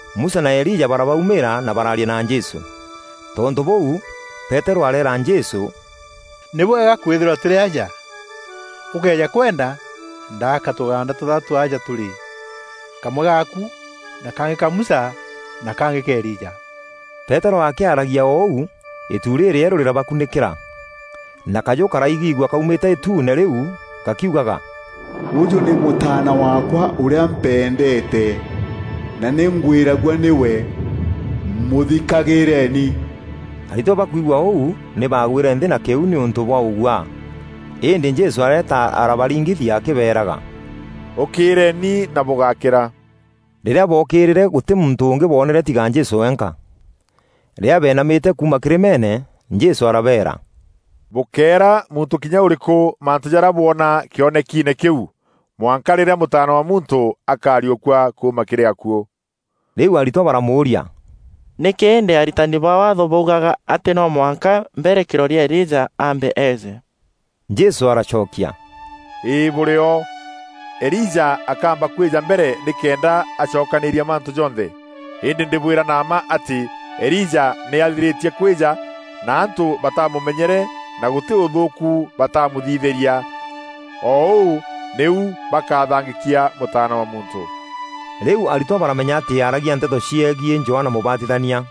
Musa na Elija barabaumîîra na baraaria na Jesû. Tontû bûû, Peterû areera Jesû, “Nî bwega kwithîrwa tûrî aja! Ûkëeja kwenda, ndaaka tûgaanda tûthatû aja tûrî, kamwe gaaku, na kangî ka Musa na kangî ka Elija.” Peterû akîaragia o ûu, îtu rîrîerû rîrabakunîkîra, na kajû karaigîgua kaumîte îtuune rîu gakiugaga, “Ûjû nî Mûtaana waakwa ûrîa mpendeete na nî ngwîragua nîwe, mûthikagîîreni.” Aritwa bakûigua ûu nî baagwîre nthî na kîuu nîûntû bwa ûguaa. Îndî Jesû areeta arabaringithia akîbeeraga, “Ûkîîreeni, na bûgákîra.” Rîrîa bookîîrîre gûtî muntû ûngî boonere tiga Jesû wenka. Rîrîa beenamîte kuuma kîrîmeene, Jesû arabeera, “Bûkéera muntû kinya ûrîkû mantû jarîa bwona kîonekiine kîu, mwanka rîrîa Mûtaana wa Muntû akariûkua kuuma kîrî akuû.” Rîu aritwa baramûûria, “Nîkî îndî aritani ba Waatho baugaga atî no mwanka mbere kîroria Elija aambe eeje?” Jesû aracokia, “Îî bûrio, Elija akamba kwîja mbere nîkenda acokanîîria mantû jonthe. Îndî ndîbwîra na mma atî Elija nî athirîtie kwîja na antû batamûmenyere na gûtî ûthûûku batamûthithîria. O ûu nîu bakathangîkia Mûtaana wa Muntû.” Rîu aritwa baramenya atî aaragia nteto ciegiî Johana Mûbatithania.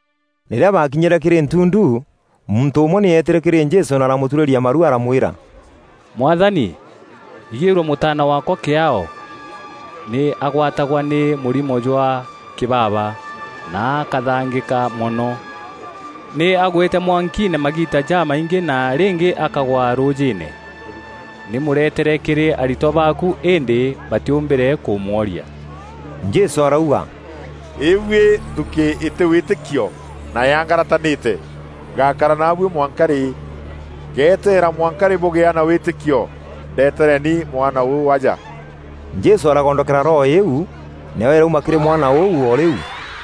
Rîrîa baakinyîre kîrî ntundu, muntû ûmwe nî eetîre kîrî Jesû na aramûturîria maru aramwîra, “Mwathani, igîrua mûtaana waakwa kîaao! Nî agwatagwa nî mûrimo jwa kîbaba, na akathangîka mono. Nî agwîte mwankiine magiita jamaingî na ringî akagwa rûûjîîne. Nî mûretere kîrî aritwa baaku îndî batîûmbîre kûmworia.” Jesû arauga, “Îbuî nthuukî îtî wîtîkio na yaangaratanîte! Ngakara naabuî mwanka rî? Ngeteera mwanka rî bûgîa na wîtîkio? Ndetereni mwana ûu aja.” Jesû aragondokera roho îîu, nayo îrauma kîrî mwana ûu o rîu.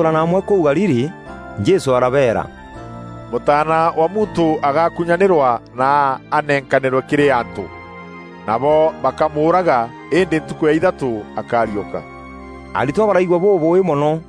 Aritwa bakûthûûrana amwe kûu Galili Jesû arabeera, “Mûtaana wa Muntû agakunyanîrwa na anenkanîrwe kîrî antû. Nabo bakamûûraga, îndî ntukû ya ithatû akariûka.” Aritwa baraigua bûûbûî mono.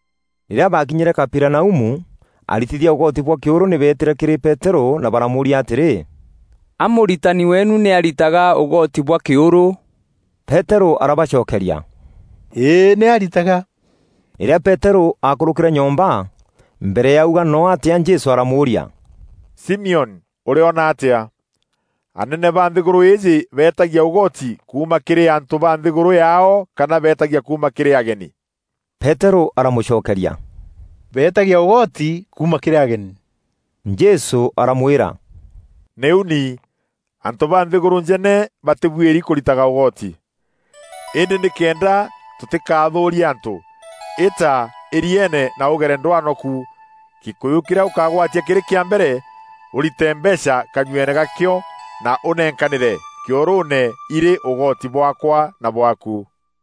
Rîrîa baakinyîre Kaperinaumu aritithia ûgoti bwa kîûrû nî beetîre kîrî Peterû na baramûûria atîrî, “A mûritani weenu nî aritaga ûgoti bwa kîûrû?” Peterû arabacokeria, “Îî nî aritaga.” Rîrîa Peterû aakûrûkîre nyomba, mbere ya auga noo atîa Jesû aramûûria, “Simioni, ûriona atîa? Anene ba nthîgûrû îîjî beetagia ûgoti kuuma kîrî antû ba nthîgûrû yaao kana beetagia kuuma kîrî ageni?” Peterû aramûcokeria, “Beetagia ûgoti kuuma kîrî ageni.” Jesû aramwîra, “Nîu ni, antû ba nthîgûrû njene batîbuîri kûritaga ûgoti. Îndî nîkenda tûtîkathûûrie antû, îta îrieene na ûgere ndwano ku. Gîkûyû kîrîa ûkagwatia kîrî kîa mbere, ûrîte mbeecha kanyueene ga kîo na ûnenkanîre kîûrûûne îrî ûgoti bwaakwa na bwaaku!”